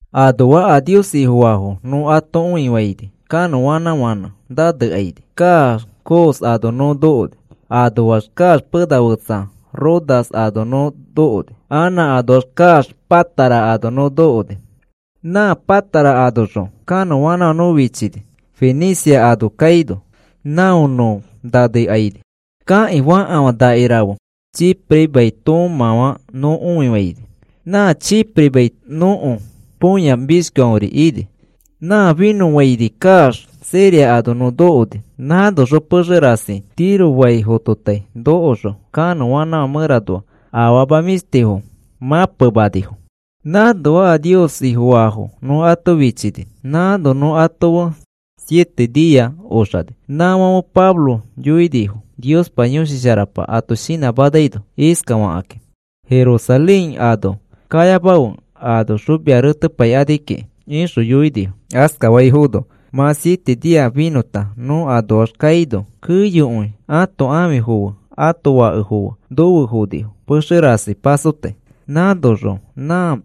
Anoa a Nios Ifofaafo nõ ato õifaini, kanõanãfãnẽ nõ nanekaini kaax Cos ano nõ nokoni. Anoax kaax pena fetsa Rodas ano nõ nokoni, anã anoax kaax Pátara ano nõ nokoni. Nã Pátara anoxõ kanõanãfã nõ fichini Fenicia ano kaino, não nõ nanekaini. Kakĩ fakafã nakirafe Chipre mai toomãfã nõ õifaini. Nã Chipre mai nõko põya mishkiori ini. Nã finõfaini kaax Siria ano nõ nokoni. Nãnoxõ pexe rasi Tiro fai fototai nokoxõ kanõanãfã mẽranoa afama mĩshtifo mãpemanifo. Nãnoa a Nios Ifofaafo nõ ato fichini, nãno nõ ato fe siete nia oxani. Nãfãfe Pablo yoinifo Niospa Yõshi Sharapa ato shinãmanaino iskafakakĩ: “Jerusalén ano kayamafe. Anoxõ mia retepaikani kiki,” ixõ yoinifo. Askafaifono mã siete nia finõta nõ anoax kaino, keyokõi ãto ãfifo fe ãto fakefo fe nofe fonifo pexe rasi pasotai. Nãnoxõ nã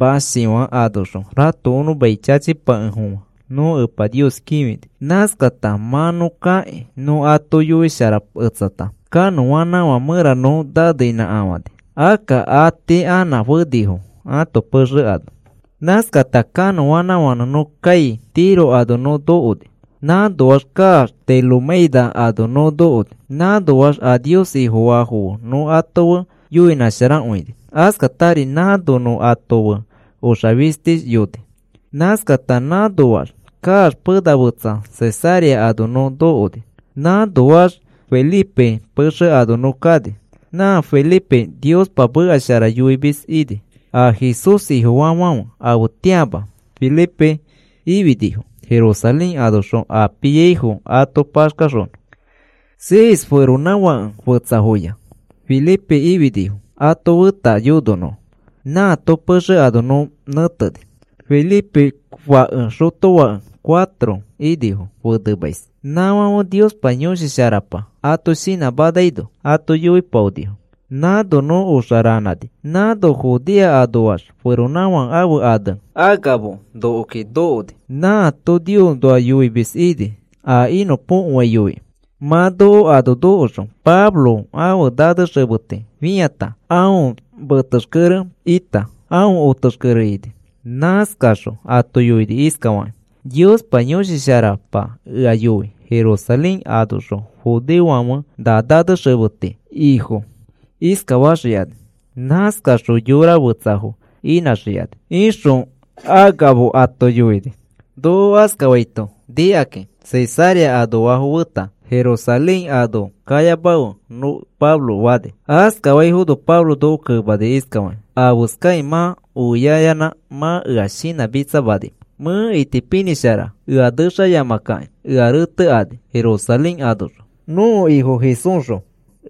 mãshifã anoxõ ratokonõ mai chachipakefofã nõ Epa Nios kĩfini. Nãskata mã nõ kakĩ nõ ato yoisharaketsata, kanõanãfã mẽra nõ naneinãkafani, akka atii anã fenifo ãto pexe ano. Nãskata kanõanãfãnẽ nõ kai Tiro ano nõ nokoni, nãnoax kaax Tolemaida ano nõ nokoni. Nãnoax a Nios Ifofaafo fe nõ ato fe yoinãsharakõini, askatari nãno nõ ato fe oxa fishtiyoni. Nãskata nãnoax kaax pena fetsa Cesarea ano nõ nokoni. Nãnoax Felipe pexe ano nõ kani. Nã Felipe Niospa meka shara yoimis ini. A Jesús Ifofaafãfe afetĩama Felipe ifinifo Jerusalén anoxõ a piaifo ato paxkaxonõ. Seis feronãfake fetsafoya Felipe ifinifo ato feta yononõ. Nãato pexe ano nõ nẽteni. Felipe fake xotofake cuatro inifo fenemais. Nãfãfe Niospa Yõshi Sharapa ato shinãmanaino ato yoipaonifo. Nãno nõ oxa ranãni, nãno Judea anoax feronãfake ãfe ane Agabo nokoki nokoni. Nãato Niosnoa yoimis ini, a inõpokoai yoikĩ. Mã noko ano nokoxõ, Pablo ãfe nanexemeti fĩata, aõ metexkere ita aõ otexkere ini. Nãskaxõ ato yoini iskafakĩ: “Niospa Yõshi Sharapa ea yoi Jerusalén anoxõ judeofãfe na nanexemeti ifo iskafaxikani. Nãskaxõ yora fetsafo inãxikani,” ixõ Agabo ato yoini. Noko askafaito nikakĩ Cesarea anoafo feta, “Jerusalén ano kayamafe,” nõ Pablo fani. Askafaifono Pablo noko kemani iskafakĩ: “¿Afeskakĩ mã oiaiyanã mã ea shinãmitsamanimẽ? Mẽ itipinĩshara ea nexayamakakĩ ea retekani Jerusalén anoxõ, nõko Ifo Jesúsxõ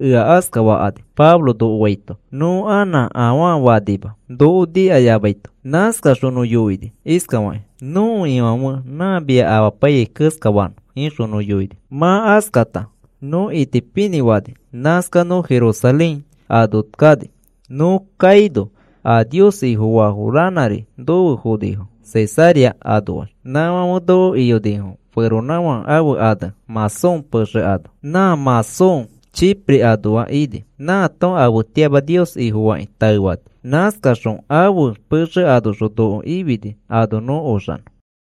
ea askafakani,” Pablo noko faito, nõ anã afaa fanima noko nikayamaito. Nãskaxõ nõ yoini iskafakĩ: “Nõko Ifãfe nã mia apaiyai keskafanõ,” ixõ nõ yoini. Mã askata nõ itipinĩ fani, nãskax nõ Jerusalén ano kani. Nõ kaino a Nios Ifofaafo ranãri nofe fonifo Cesarea anoax. Nãfãfe noko iyonifo feronãfake ãfe ane Mnasón pexe ano, nã Mnasón Chipre anoa ini. Nãato afetĩama Nios Ifofakĩ taefani. Nãskaxõ ãfe pexe anoxõ noko ifini ano nõ oxanõ.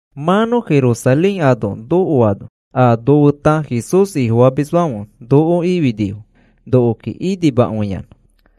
Mã nõ Jerusalén ano nokoano a nofeta Jesús Ifofamisfãfe noko ifinifo nokoki inimakõiyanã.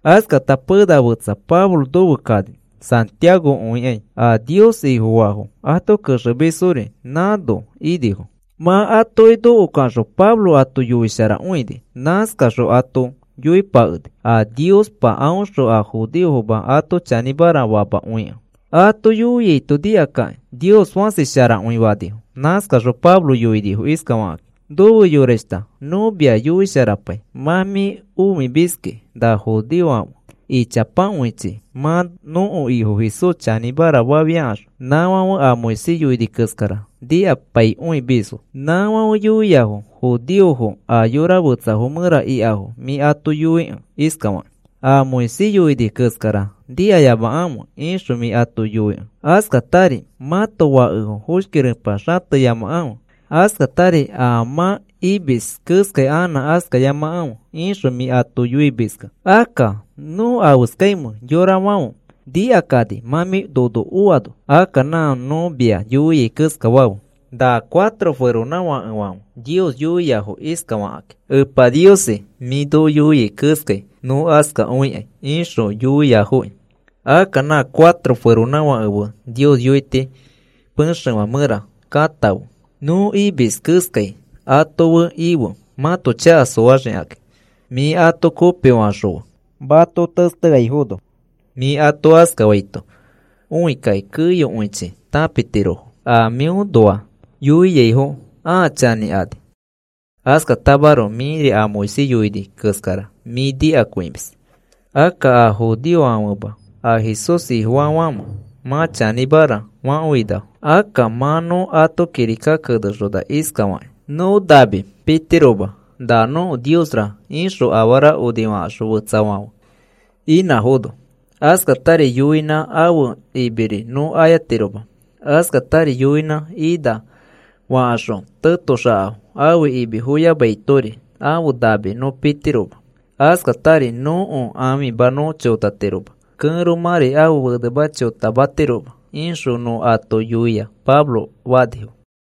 Askata pena fetsa Pablo nofe kani Santiago õikai. A Nios Ifofaafo ato kexemisfori nãno inifo. Mã atoki nokoxõ Pablo ato yoisharakõini. Nãskaxõ ato yoipakeni a Niospa aõxõ a judeofoma ato chanĩmara famakõikẽ. Ato yoiaito nikakakĩ, “Nios fãsi sharakõi,” fanifo. Nãskaxõ Pablo yoinifo iskafakakĩ: “Nofe yorashta, nõ mia yoisharapai, mã mĩ õimiski na judeofãfe ichapakõichi mã nõko Ifo Jesús chanĩmara fafiakaxõ, nãfãfe a Moisés yoini keskara nikapaikõimisfo. Nãfãfe yoiafo judeofo a yora fetsafo mẽra ikafo mĩ ato yoikẽ iskafaki: ‘A Moisés yoini keskara nikayamakãfe,’ ixõ mĩ ato yoikẽ, ‘Askatari mãto fakefo foshki repa xateyamakãfe, askatari a mã imis keskai anã askayamakãfe,’ ixõ mĩ ato yoimiskẽ. Akka, ¿nõ afeskaimẽ, yorafãfe nikakani mã mĩ nono oano? Akka nã nõ mia yoiai keskafe. Na cuatro feronãfakefãfe Nios yoiafoki iskafakakĩ: ‘Epa Niosi, mĩ noko yoia keskai nõ askakõikai,’ ixõ yoiafoki. Akka na cuatro feronãfake fe Nios yoiti pexefã mẽra katãfe, nõ imis keskai ato fe ife mãto chaka soaxikakĩ. Mĩ ato kopifaxõfe mato testeaifono. Mĩ ato askafaito õikakĩ keyokõichi tãpitirofo a mĩõnoa yoiaifo ãa chanĩkani. Askatamaroko mĩri a Moisés yoini keskara mĩ nikakõimis. Akka a judeofofãfema a Jesús Ifofaafãfe mã chanĩmara fakõinafo. Akka mã nõ ato kirika kenexona iskafakĩ: ‘Nõ nami pitiroma na nõko niosra ixõ afara onifakaxõ fetsafãfe inãfono. Askatari yoinãfo ãfe imiri nõ ayatiroma. Askatari yoinã ina fakaxõ tetoxakafo ãfe imi foyamaitori ãfe nami nõ pitiroma, askatari nõko ãfima nõ chotatiroma, kẽromãri ãfe fenema chotamatiroma,’ ixõ nõ ato yoia,” Pablo fanifo.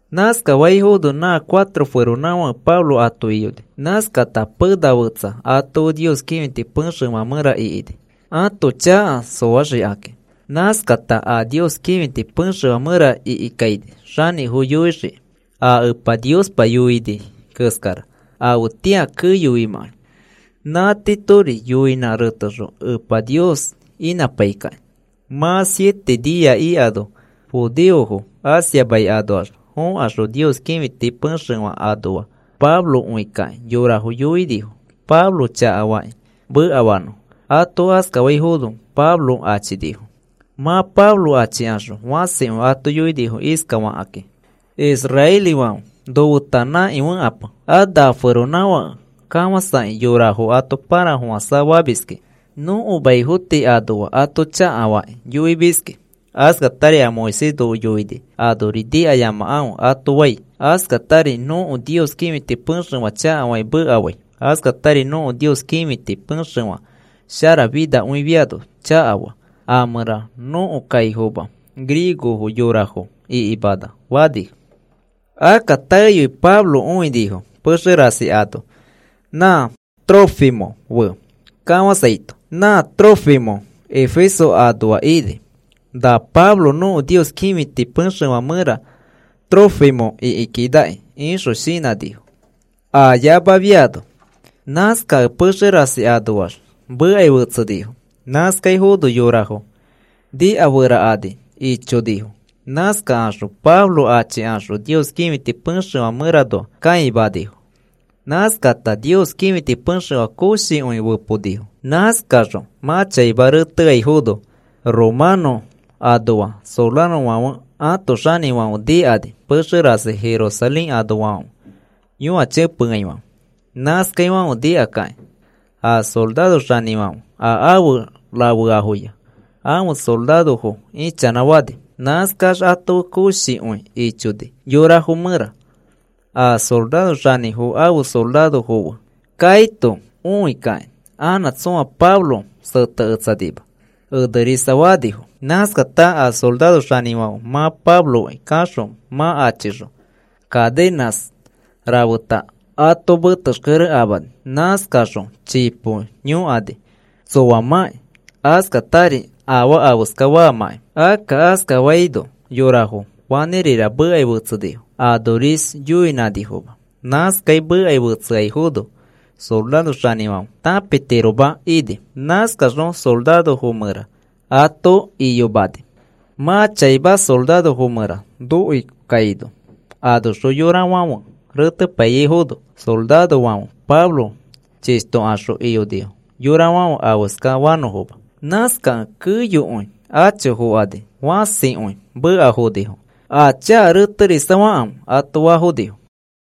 Nãskafaifono nã cuatro feronãfake Pablo ato iyoni. Nãskata pena fetsa ato fe Nios kĩfiti pexefã mẽra ikini, ãto chaka soaxikakĩ. Nãskata a Nios kĩfiti pexefã mẽra ikikaini xanĩfo yoixiki a Epa Niospa yoini keskara afetĩa keyoimãkai, nã tiitori yoinã retexõ Epa Nios inãpaikakĩ. Mã siete nia ikano judeofo Asia mai anoax fokaxõ Nios kĩfiti pexefã anoa Pablo õikakĩ yorafo yoinifo Pablo chakafakĩ mekafanõfo. Ato askafaifono Pablo achinifo. Mã Pablo achikaxõ fãsikõi ato yoinifo iskafakakĩ: “Israelifãfe, nofeta nãkifẽkape, a na feronãfake kafãsakĩ yorafo ato pãrafofãsa famiski. Nõko maifo tii anoa ato chakafakĩ yoimiski. Askatari a Moisés noko yoini anori nikayamakãfe ato fai. Askatari nõko Nios kĩfiti pexefã chakafakĩ mekafai. Askatari nõko Nios kĩfiti pexefã sharafinakõifiano chakafaa, a mẽra nõko kaifoma griego yorafo ikimana,” fanifo. Akka taeyoi Pablo õinifo pexe rasi ano nã Trófimo fe kafãsaito. Nã Trófimo Efeso anoa ini. Na Pablo nõko Nios kĩfiti pexefã mẽra Trófimo ikikinaki ixõ shinãnifo aa yamafiano. Nãskakẽ pexe rasi anoax mekai fetsenifo, nãskaifono yorafo nikaferakani ichonifo. Nãskakaxõ Pablo achikaxõ Nios kĩfiti pexefã mẽranoa kãimanifo. Nãskata Nios kĩfiti pexefã koshikõi feponifo. Nãskaxõ mã chaima reteaifono, romanõ anoa sorarofãfe ãto xanĩfãfe nikani pexe rasi Jerusalén anoafãfe yõachẽpeaifãfe. Nãskaifãfe nikakĩ a soraro xanĩfãfe a afe rafeafoya ãfe sorarofo ichanãfani. Nãskax ato fe koshikõi ichoni yorafo mẽra, a soraro xanĩfo ãfe sorarofo fe kaito õikakĩ anã tsõa Pablo seteketsanima enerisafanifo. Nãskata a soraro xanĩfãfe mã Pabloki kaxõ mã achixõ, cadenãs rafeta ato metexkere amani. Nãskaxõ chipo yõkani tsoamãki, askatari afaa afeska faamãki. Akka askafaino yorafo fanĩrira mekai fetsenifo anoris yoinifoma. Nãskai mekai fetseaifono soraro xanĩfãfe tãpitiroma ini. Nãskaxõ sorarofo mẽra ato iyomani. Mã chaima sorarofo mẽra nokoikaino, anoxõ yorafãfe retepaiyaifono, sorarofãfe Pablo chishtokaxõ iyonifo yorafãfe afeska fanõfoma. Nãskakẽ keyokõi acho fokani fãsikõi mekafonifo. “Aa chaka reterisafakãfe,” ato faafonifo.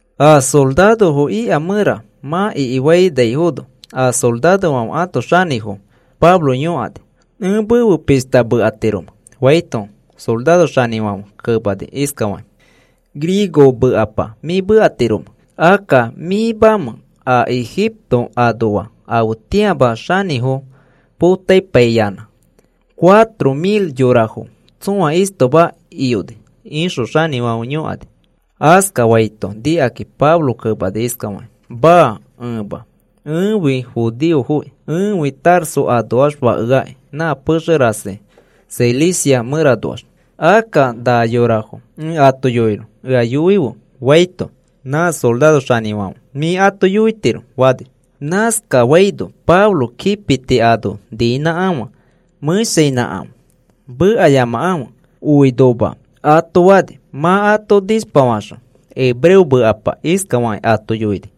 A sorarofo ika mẽra mã ikimanaifono, a sorarofãfe ãto xanĩfo Pablo yõkani: “¿Ẽ mefe pishta mekatiromẽ?” faito soraro xanĩfãfe kemani iskafakĩ: “¿Griego mekapa mĩ mekatiromẽ? Akka, ¿mĩmamẽ a Ejipto anoa afetĩama xanĩfo potapaiyanã cuatro mil yorafo tsõa istoma iyoni?” ixõ xanĩfãfe yõkani. Askafaito nikakĩ Pablo kemani iskafakĩ: “Maa, ẽma. Ẽfi judeoki. Ẽfi Tarso anoax fakeakĩ nã pexe rasi Cilicia mẽranoax. Akka na yorafo ẽ ato yoinõ ea yoife,” faito, nã soraro xanĩfãfe, “Mĩ ato yoitiro,” fani. Nãskafaino Pablo kipiti ano niinãkafã mẽshainãkafã, “Mekayamakãfe,” oinoma ato fani. Mã ato nishpafaxõ hebreo mekapa iskafakĩ ato yoini: